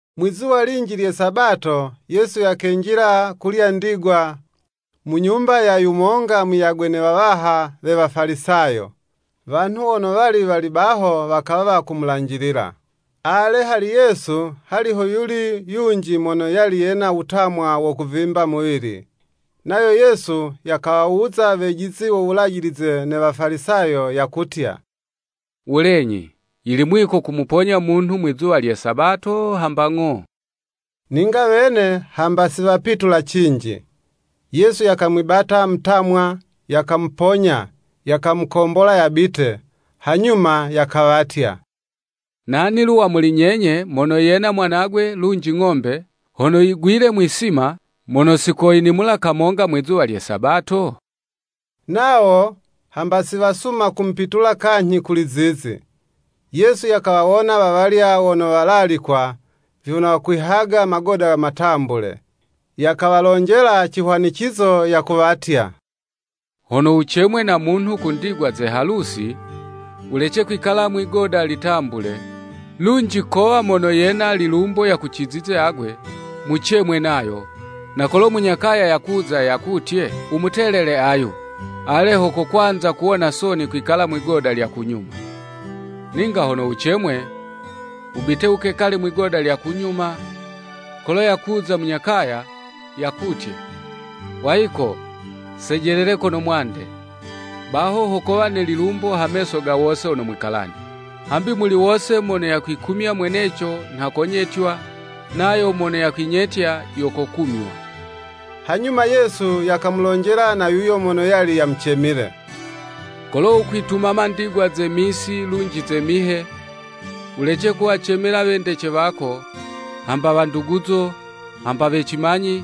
Mwizuwa linji lye Sabato, Yesu yakenjila kulya ndigwa, mu nyumba ya yumonga muyagwe ne wawaha we Wafalisayo, wanhu wono wali wali baho wakawa wakumulanjilila. Ale, hali Yesu, hali hoyuli yunji mono yali yena wutamwa wo kuvimba muwili. Nayo Yesu, yakawawuza wejizi wo Wulajilize ne Wafalisayo yakutya, “Wulenyi, yili mwiko kumuponya munhu mwizuwa lye Sabato hamba ng'o?” Ninga wene hamba siwapitula cinji. Yesu yakamwibata mutamwa, yakamuponya, yakamukombola yabite. Hanyuma yakawatya, “Nani lu wa muli nyenye mono yena mwanagwe lunji ng'ombe, hono yigwile mwi'sima, mono si koyinimula kamonga mwizuwa lye Sabato?” Nawo hamba siwasuma kumupitula kanyhi kuli zizi. Yesu yakawawona wawalya wono walalikwa, vyono wakwihaga magoda matambule, yakawalonjela cihwanicizo, yakuwatya. “Hono wucemwe na munhu ku ndigwa ze halusi, wulece kwikala mwigoda litambule; lunji kowa mono yena lilumbo yakucizize agwe, mucemwe nayo, na kolo munya kaya yakuza yakutye, ‘Wumutelele ayu.’ Ale ho kokwanza kuwona soni kwikala mwigoda lya kunyuma. Ninga hono wucemwe, wubite wukekale mwigoda lya kunyuma, kolo yakuza munya kaya, yakutye, ‘Wayiko, sejelele kono mwande,’ baho ho kowa ne lilumbo ha meso ga wose wono mwikalane. Hambi muli wose mono yakwikumya mweneco, nha konyetywa, nayo mono yakwinyetya, yo kokumywa.” Hanyuma Yesu yakamulonjela na yuyo mono yali yamucemile, “Kolo wukwitumama ndigwa ze misi lunji ze mihe, wulece kuwacemela wendece wako, hamba wanduguzo, hamba we cimanyi,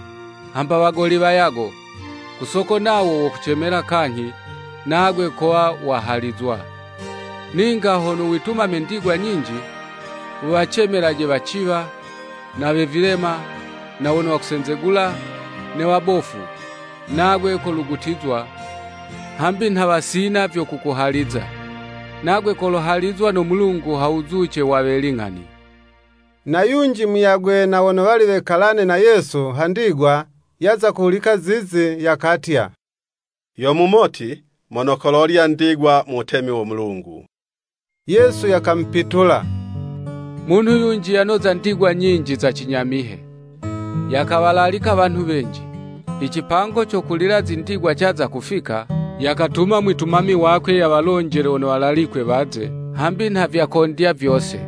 hamba wagoli wayago; ku soko nawo wokucemela kanyhi, nagwe kowa wahalizwa. Ninga hono witumame ndigwa nyinji, wuwacemelaje waciwa, na we vilema, na wono wakusenzegula, ne wabofu; nagwe kolugutizwa, hambi nha wasina vyo kukuhaliza; nagwe kolohalizwa no Mulungu ha wuzuce wa we ling'ani.” Na yunji muyagwe na wono wali wekalane na Yesu ha ndigwa, yaza kuhulika zizi, yakatya, “Yo mumoti mono kololya ndigwa mu wutemi wo Mulungu.” Yesu yakamupitula, “Munhu yunji yanoza ndigwa nyinji za cinyamihe; yakawalalika wanhu wenji. I cipango co kulila zindigwa caza kufika, yakatuma mwitumami wakwe yawalonjele wono walalikwe waze, hambi nha vyakondya vyose.”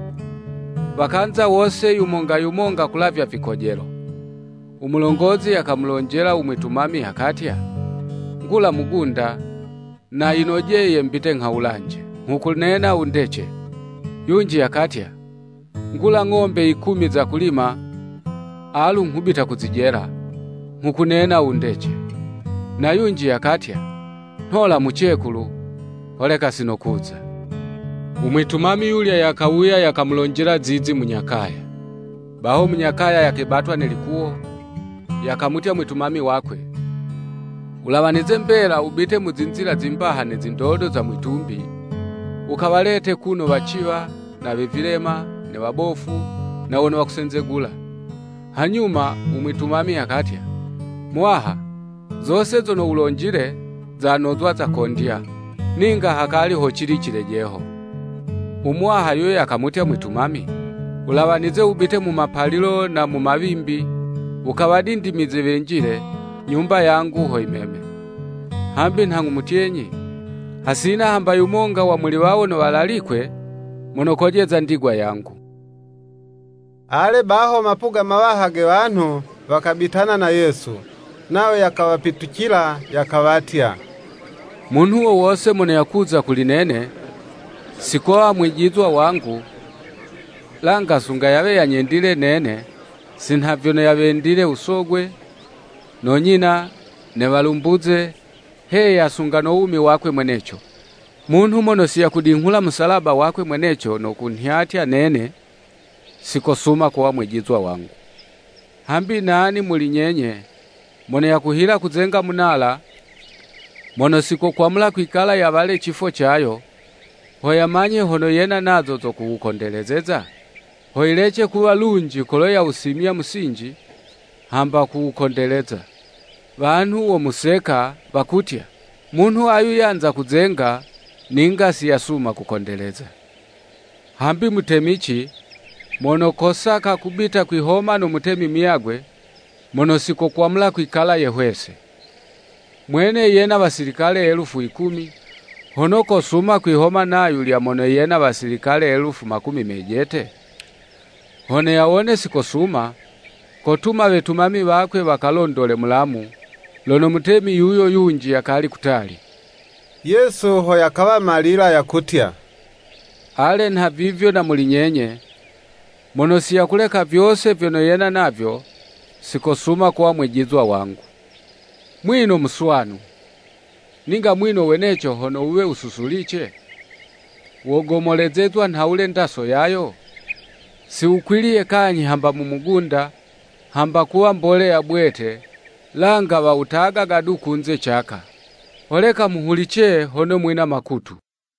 Wakanza wose yumonga yumonga kulavya vikojelo. Umulongozi yakamulonjela u mwitumami yakatya, “Ngula mugunda, na yinojeye mbite nghawulanje; nghukunena wundece.” Yunji yakatya, “Ngula ng'ombe yikumi za kulima, alu nghubita kuzijela, nghukunena wundece.” Na yunji yakatya, “Nhola mucekulu, holeka sinokuza.” U mwitumami yulya yakawuya yakamulonjela zizi munya kaya. Baho munya kaya yakebatwa ne likuwo, yakamutya mwitumami wakwe, “Wulawanize mbela wubite mu zinzila zimbaha ne zindodo za mwi'tumbi, wukawalete kuno waciwa, na we vilema, ne wabofu, na wono wakusenzegula.” Hanyuma u mwitumami yakatya, “Muwaha zose zono wulonjile, zanozwa zakondya, ninga hakali hocili cilejeho.” U muwaha yuyo yakamutya mwitumami, “Wulawanize wubite mu mapalilo na mu mawimbi wukawadindimize wenjile, nyumba yangu ho yimeme. Hambi nha nghumutyenyi, hasina hamba yumonga wa muli wawo wono walalikwe, mono kolojeza ndigwa yangu.” Ale, baho mapuga mawaha ge wanhu, wakabitana na Yesu. Nayo yakawapitucila yakawatya. Munhu wo wose mono yakuza kuli nene, si kowa mwijizwa wangu, langa sunga yawe yanyendile nene si nha vyono yawendile u sogwe, no nyina, ne walumbuze, heya, sunga no wumi wakwe mweneco. Munhu mono siyakudinghula musalaba wakwe mweneco, no kunhyatya nene, si kosuma kuwa mwijizwa wangu. Hambi nani muli nyenye, mono yakuhila kuzenga Munala, mono si kokwamula kwikala yawale cifo cayo, ho yamanye hono yena nazo zo kuwukondelezeza? Ho yilece kuwa lunji kolo yawusimya musinji, hamba kuwukondeleza. Wanhu womuseka, wakutya; “Munhu ayu yanza kuzenga, ninga si yasuma kukondeleza. “Hambi mutemici, mono kosaka kubita kwihoma no Mutemi muyagwe, mono si kokwamula kwikala yehwese. Mwene yena wasilikale elufu yikumi, hono kosuma kwihoma na yulya mono yena wasilikale elufu makumi mejete? Hono yawone si kosuma, kotuma wetumami wakwe yakalondole mulamu, lono mutemi yuyo yunji yakali kutali.” Yesu ho yakawa malila yakutya, “Ale nhavivyo na muli nyenye, mono si yakuleka vyose vyono yena navyo, sikosuma kuwa mwijizwa wangu.” “Mwino muswanu; ninga mwino weneco hono wuwe wususulice, wogomolezezwa nhawule ndaso yayo? Si wukwiliye kanyhi hamba mu mugunda, hamba kuwa mboleya bwete langa wawutagaga du kunze caka. Holeka muhulice, hono mwina makutu!”